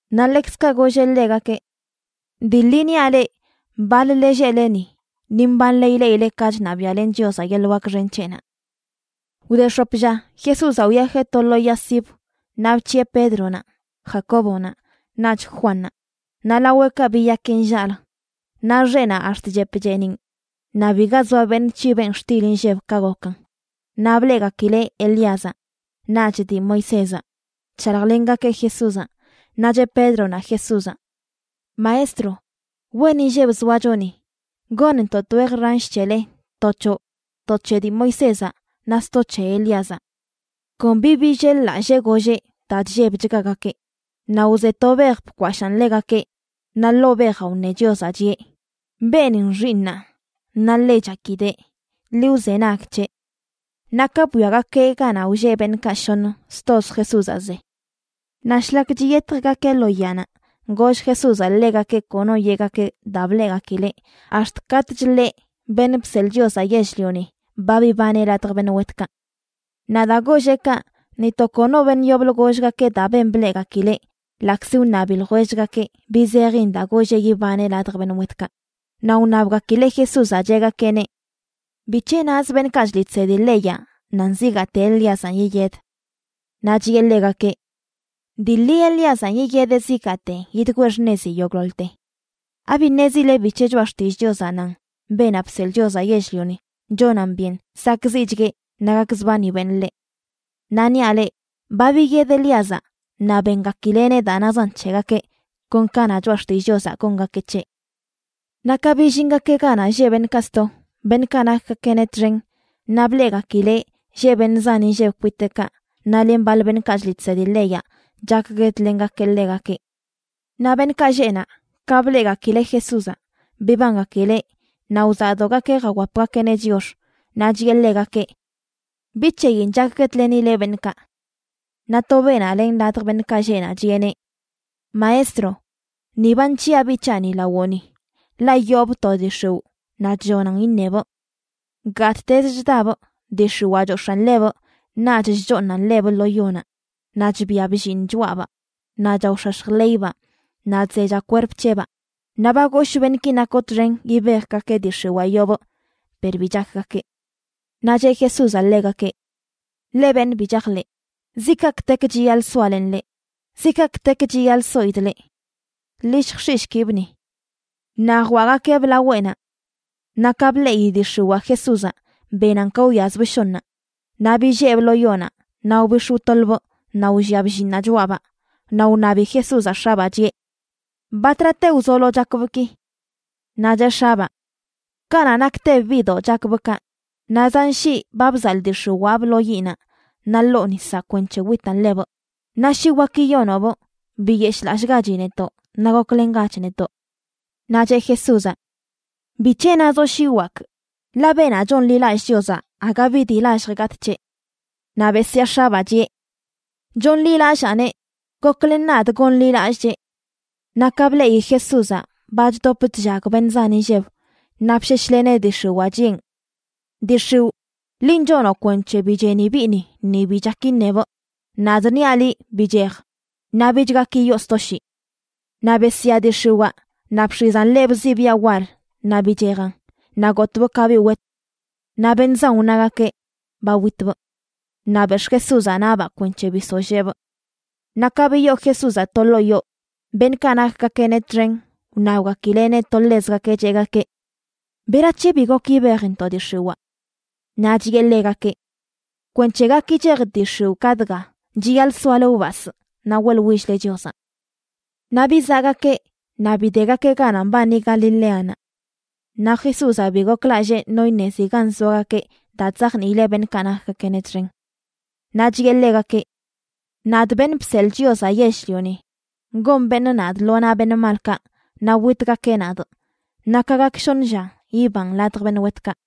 Naꞌ ḻekzkaꞌ golleꞌ ḻegakeꞌ: ―Dii ḻi niaꞌ leꞌ, baḻ-le lleꞌleni, ni mbanle ileꞌile ka chṉabiaꞌlen Chiozaꞌ yeḻꞌ wak xen c̱heꞌnaꞌ. Wde x̱op lla, Jesúzaꞌ wyajeꞌ to lo yaa sibə, naꞌ bc̱hiꞌe Pédronaꞌ, Jacóbonaꞌ naꞌch Juannaꞌ. Naꞌ laweꞌkaꞌ biyakeꞌ nllaꞌlə. Naꞌ xeꞌnaꞌ ax̱t chep cheeniꞌn, naꞌ biga zoa beṉꞌ c̱hibeꞌn xtil inlleb ka gokan. Naꞌ bleꞌgakileꞌ Elíazaꞌ naꞌch dii Moisézaꞌ chshaljlengakeꞌ Jesúzaꞌ. Naꞌ cheꞌ Pédronaꞌ Jesúzaꞌ: ―Maestro, ¡wen inlleb zoacho ni! Gonntoꞌ twej ransh c̱hele, to c̱hoꞌ, to c̱he dii Moisézaꞌ, naꞌ sto c̱he Elíazaꞌ. Kon bi billel-lallee golleꞌ, daa chllebchgagakeꞌ. Naꞌ wze to bej bkwashaan ḻegakeꞌ, naꞌ ḻoo bejaꞌ wṉe Chiozaꞌ, chiꞌe: ―Beenin xiiṉaa, naꞌ ḻe chakidee. Ḻi wzenag c̱heꞌ. Naꞌ ka bwiagakeꞌ ganaꞌ wlleꞌ beṉꞌkaꞌ shoṉ, stoz Jesúzaꞌ ze. Naꞌ shlak chiyetjgakeꞌ lo yaanaꞌ, goll Jesúzaꞌ ḻegakeꞌ kono yeꞌgakeꞌ daa bleꞌgakileꞌ ax̱t katꞌch ḻeꞌ, Beṉꞌ Bseḻꞌ Chiozaꞌ Yell-lioni, ba bibaneꞌ ladj beṉꞌ wetkaꞌ. Naꞌ daa golleꞌ kaꞌ, ni to kono beṉꞌ yoblə gollgakeꞌ daa ben bleꞌgakileꞌ, ḻaꞌkzi wṉabi ljwellgakeꞌ, bi zejin daa golleꞌ yibaneꞌ ladj beṉꞌ wetkaꞌ. Naꞌ wṉabgakileꞌ Jesúzaꞌ, cheꞌgakeꞌneꞌ: ―¿Bic̱he naz beṉꞌkaꞌ chliꞌ chsedi leyaꞌ nan zigaate Elíazanꞌ yiyed? Naꞌ chiꞌe ḻegakeꞌ: ―Dii ḻi, Elíazaꞌ yideꞌ zigaate yidgwee xṉezi yogꞌḻoḻte. ¿Abi ṉezile bic̱he Choꞌa Xtillꞌ Chiozaꞌ nan Beenaꞌ Bseḻꞌ Chiozaꞌ Yell-lioni chonan byen sakꞌziꞌchgueꞌ naꞌ gakzbani beṉꞌ ḻeꞌ? Naꞌ niaꞌ leꞌ, ba biyed Elíazaꞌ, naꞌ bengakileꞌneꞌ daa nazan c̱hegakeꞌ, kon ka na Choꞌa Xtillꞌ Chiozaꞌ gongakeꞌ c̱heꞌ. Naꞌ ka billingakeꞌ ganaꞌ lleꞌ beṉꞌkaꞌ sto, beṉꞌkaꞌ nakgakeꞌneꞌ txen, naꞌ bleꞌgakileꞌ lleꞌ beṉꞌ zan inlleb kwiteꞌkaꞌ, naꞌ len baḻ beṉꞌkaꞌ chliꞌ chsedi leyaꞌ chakguedlengakeꞌ ḻegakeꞌ. Naꞌ beṉꞌkaꞌ lleꞌ naꞌ ka bleꞌgakileꞌ Jesúzaꞌ, bibangakileꞌ naꞌ wzaꞌdogakeꞌ jawapgakeꞌneꞌ chiox. Naꞌ chiꞌe ḻegakeꞌ: ―¿Bi c̱heyin chakguedlenile beṉꞌkaꞌ? Naꞌ to beenaꞌ len ladj beṉꞌkaꞌ lleꞌ naꞌ chiꞌeneꞌ: ―Maestro, ni ba nc̱hiꞌa biꞌ c̱haꞌni lawoꞌni, ḻaꞌ yoobꞌ to dii x̱iwꞌ naꞌ chllonan iṉebꞌ. Gattezə chdabꞌ dii x̱iwaa chox̱aꞌn ḻebꞌ naꞌch chchooṉan ḻebꞌ lo yonaꞌ. Naꞌ chbia bllinꞌ choꞌabaa, naꞌ chaox̱ax̱j ḻeybaa naꞌ chzecha kwerp c̱heꞌbaa. Naꞌ ba goshꞌ beṉꞌki nakoꞌ txen yibejgakeꞌ dii x̱iwaa yoobꞌ, per bi chakgakeꞌ. Naꞌ cheꞌ Jesúzaꞌ ḻegakeꞌ: ―¡Leꞌ beṉꞌ bi chajḻeꞌ! ¿Ziꞌ kaꞌkꞌtek chiyaḻꞌ soalenꞌ leꞌ? ¿Ziꞌ kaꞌkꞌtek chiyaḻꞌ soidꞌ leꞌ? Ḻi lljx̱iꞌshkibꞌ ni. Naꞌ jwaꞌgakeꞌbꞌ laweꞌnaꞌ. Naꞌ ka bleꞌi dii x̱iwaa Jesúzaꞌ, benan ka wyazbꞌ shoṉaꞌ. Naꞌ billeebꞌ lo yonaꞌ naꞌ wbix̱ wtoḻbꞌ naꞌ wllia bllinꞌnaꞌ choꞌabaa. Naꞌ wṉabi Jesúzaꞌ x̱abaa, chiꞌe: ―¿Batrate wzolo chakbꞌ ki? Naꞌ cheꞌ x̱abaa: ―Kanaꞌ naktebꞌ biꞌdoꞌ chakbꞌ kaꞌ. Naꞌ zan shii ba bzaḻꞌ dii x̱iwaabꞌ lo yiꞌnaꞌ naꞌ ḻoo nisaꞌ kwenc̱he witan ḻebꞌ. Naꞌ shi wak yiyonoꞌbꞌ, biyeshꞌlallꞌgachi netoꞌ naꞌ goklengach netoꞌ. Naꞌ cheꞌ Jesúzaꞌ: ―¿Bic̱he nazoꞌ shi wakꞌ?, ḻaꞌ beenaꞌ chonḻilallꞌ Chiozaꞌ aga bi dii lallj gatꞌ c̱heꞌ. Naꞌ besyaa x̱abaa, chiꞌe: ―Chonḻilallaaneꞌ. ¡Goklen nadꞌ gonḻilallꞌchee! Naꞌ ka bleꞌi Jesúzaꞌ ba chdop chllag beṉꞌ zan inlleb, naꞌ bsheshleneꞌ dii x̱iwaa, chiꞌen: ―Dii x̱iwꞌ, linꞌ chonoꞌ kwenc̱he bi cheni biꞌni ni bi chak iṉebꞌ, nadꞌ niaꞌ liꞌ, bichej, naꞌ bich gak yiyoo sto shii. Naꞌ besyaa dii x̱iwaa, naꞌ bx̱izan ḻebꞌ zibiaꞌ wal naꞌ bichejan, naꞌ gotbꞌ ka biꞌ wet. Naꞌ beṉꞌ zan wnagakeꞌ: “Ba witbꞌ.” Naꞌ bex̱ꞌ Jesúzaꞌ naꞌbaꞌ kwenc̱he bisolleebꞌ. Naꞌ ka biyoo Jesúzaꞌ to ḻoo yoo, beṉꞌkaꞌ nakgakeꞌneꞌ txen wṉabgakileꞌneꞌ to ḻezgakeꞌ, cheꞌgakeꞌ: ―¿Berac̱he bi gok yibejntoꞌ dii x̱iwaa? Naꞌ chiꞌe ḻegakeꞌ: ―Kwenc̱he gak yichej dii x̱iwꞌ ka dga, chiyaḻꞌ soale wbasꞌ naꞌ weꞌḻwill-le Chiozaꞌ. Naꞌ bizaꞌgakeꞌ, naꞌ bidegakeꞌ ganaꞌ mbani Galileanaꞌ. Naꞌ Jesúzaꞌ bi goklallee no iṉezi gan zoagakeꞌ daa chzajniileꞌ beṉꞌkaꞌ nakgakeꞌneꞌ txen. Naꞌ chiꞌe ḻegakeꞌ: ―Nadꞌ, Beṉꞌ Bseḻꞌ Chiozaꞌ Yell-lioni, gon beṉꞌ nadꞌ lo naꞌ beṉꞌ malkaꞌ naꞌ witgakeꞌ nadꞌ, naꞌ ka gak shoṉ lla, yibanꞌ ladj beṉꞌ wetkaꞌ.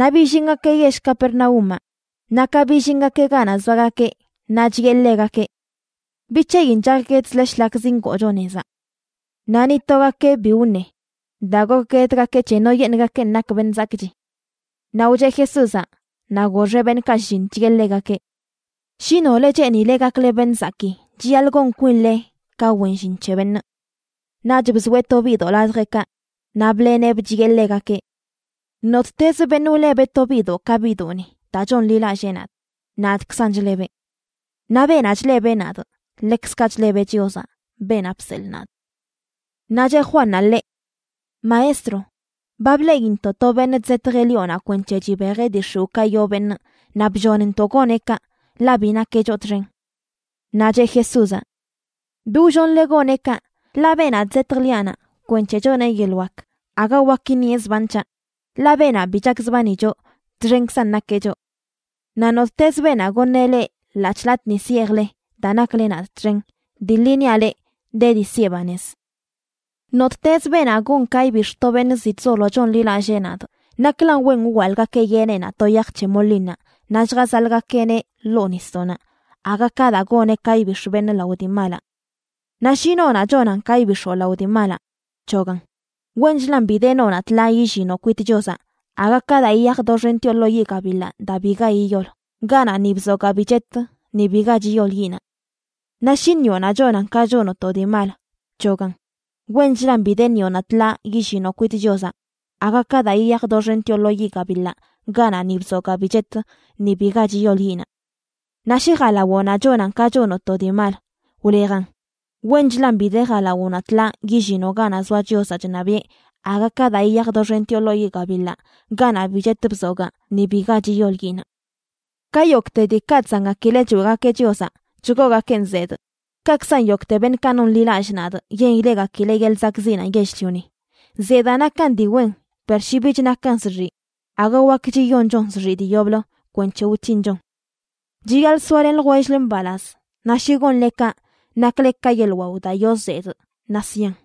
Naꞌ billingakeꞌ yell Capernaúmaꞌ. Naꞌ ka billingakeꞌ ganaꞌ zoagakeꞌ, naꞌ chiꞌe ḻegakeꞌ: ―¿Bi c̱heyin chakguedzle shlak zingoocho nezaꞌ? Naꞌ ni togakeꞌ bi wṉe, daa gokguedgakeꞌ c̱he noyeṉꞌgakenꞌ nak beṉꞌ zakꞌchi. Naꞌ wcheꞌ Jesúzaꞌ naꞌ goxeꞌ beṉꞌkaꞌ shlliṉ, chiꞌe ḻegakeꞌ: ―Shi nole cheenile gakle beṉꞌ zakii, chiyaḻꞌ gon kwinle ka wen llin c̱he beṉꞌ. Naꞌch bzoeꞌ to biꞌdoꞌ ladjeꞌkaꞌ. Naꞌ bḻeneꞌbꞌ chiꞌe ḻegakeꞌ: ―Nottezə beṉꞌ wlebeꞌ to biꞌdoꞌ ka biꞌdoꞌni daa chonḻilallee nadꞌ, nadꞌkzan chlebeꞌ. Naꞌ beenaꞌ chlebeꞌ nadꞌ, ḻekzkaꞌ chlebeꞌ Chiozaꞌ, beenaꞌ bseḻꞌ nadꞌ. Naꞌ cheꞌ Juannaꞌ ḻeꞌ: ―Maestro, ba bleꞌintoꞌ to beṉꞌ chzetjeꞌ lioꞌnaꞌ kwenc̱he chibejeꞌ dii x̱iwꞌkaꞌ yoo beṉꞌ naꞌ bllonntoꞌ goneꞌ kaꞌ, ḻaꞌ bi nakeꞌ choꞌ txen. Naꞌ cheꞌ Jesúzaꞌ: ―Bi wllonle goneꞌ kaꞌ, ḻaꞌ beenaꞌ chzetj liaꞌnaꞌ kwenc̱he choneꞌ yeḻꞌ wak, aga wak iṉieꞌ zban c̱haꞌ. Ḻaꞌ beenaꞌ bi chakzbani choꞌ, txenkzan nakeꞌ choꞌ. Naꞌ nottezə beenaꞌ goṉeꞌ leꞌ ḻaꞌc̱hꞌ latꞌ nis yeejle daa nakle nadꞌ txen, dii ḻi niaꞌ leꞌ, de dii siꞌe banez. ’Nottezə beenaꞌ gon ka ibix̱ to beṉꞌ ziꞌ chzolo chonḻilallee nadꞌ, naklan wen wwaḻꞌgakeꞌ yeneꞌnaꞌ to yaj c̱he molinnaꞌ naꞌ lljazaḻꞌgakeꞌneꞌ ḻoo nisdoꞌnaꞌ aga ka daa goneꞌ ka ibix̱ beṉꞌ lao dii malaꞌ. Naꞌ shi noonaꞌ chonan ka ibix̱oꞌ lao dii malaꞌ, bc̱hogan. Wenchlan bi de noonaꞌ tḻaa yillinoꞌ kwit Chiozaꞌ aga ka daa yiyaj doxentioꞌ lo yiꞌ gabiḻaꞌ daa biga yiyol, ganaꞌ ni bzogaa bi chet ni biga chiyol yiꞌnaꞌ. Naꞌ shi ṉiꞌonaꞌ chonan ka chonoꞌ to dii mal, bc̱hogan. Wenchlan bi de ṉiꞌonaꞌ tḻaa yillinoꞌ kwit Chiozaꞌ aga ka daa yiyaj doxentioꞌ lo yiꞌ gabiḻaꞌ, ganaꞌ ni bzogaa bi chet ni biga chiyol yiꞌnaꞌ. Naꞌ shi jalawoꞌnaꞌ chonan ka chonoꞌ to dii mal, wlejan. Wenchlan bi de jalawoꞌnaꞌ tḻaa yillinoꞌ ganaꞌ zoa Chiozaꞌ chṉabiꞌe aga ka daa yiyaj doxentioꞌ lo yiꞌ gabiḻaꞌ, ganaꞌ bi chet bzogaa ni biga chiyol yiꞌnaꞌ. ’Ka yogꞌte diikaꞌ chzangakileꞌ choeꞌgakeꞌ Chiozaꞌ chgoogakeꞌn zedꞌ, kaꞌkzan yogꞌte beṉꞌkaꞌ nonḻilallꞌ nadꞌ yen ileꞌgakileꞌ yeḻꞌ zakꞌziꞌnaꞌ yell-lioni. Zedaa nakan dii wen, per shi bich nakan zxiꞌ, aga wakch yiyonchon zxiꞌ dii yoblə kwenc̱he wc̱hinchon. Chiyaḻꞌ soalen ljwell-le mbalaz, naꞌ shi gonle kaꞌ, nakle ka yeḻꞌ wao daa yoo zedꞌ naꞌ sian.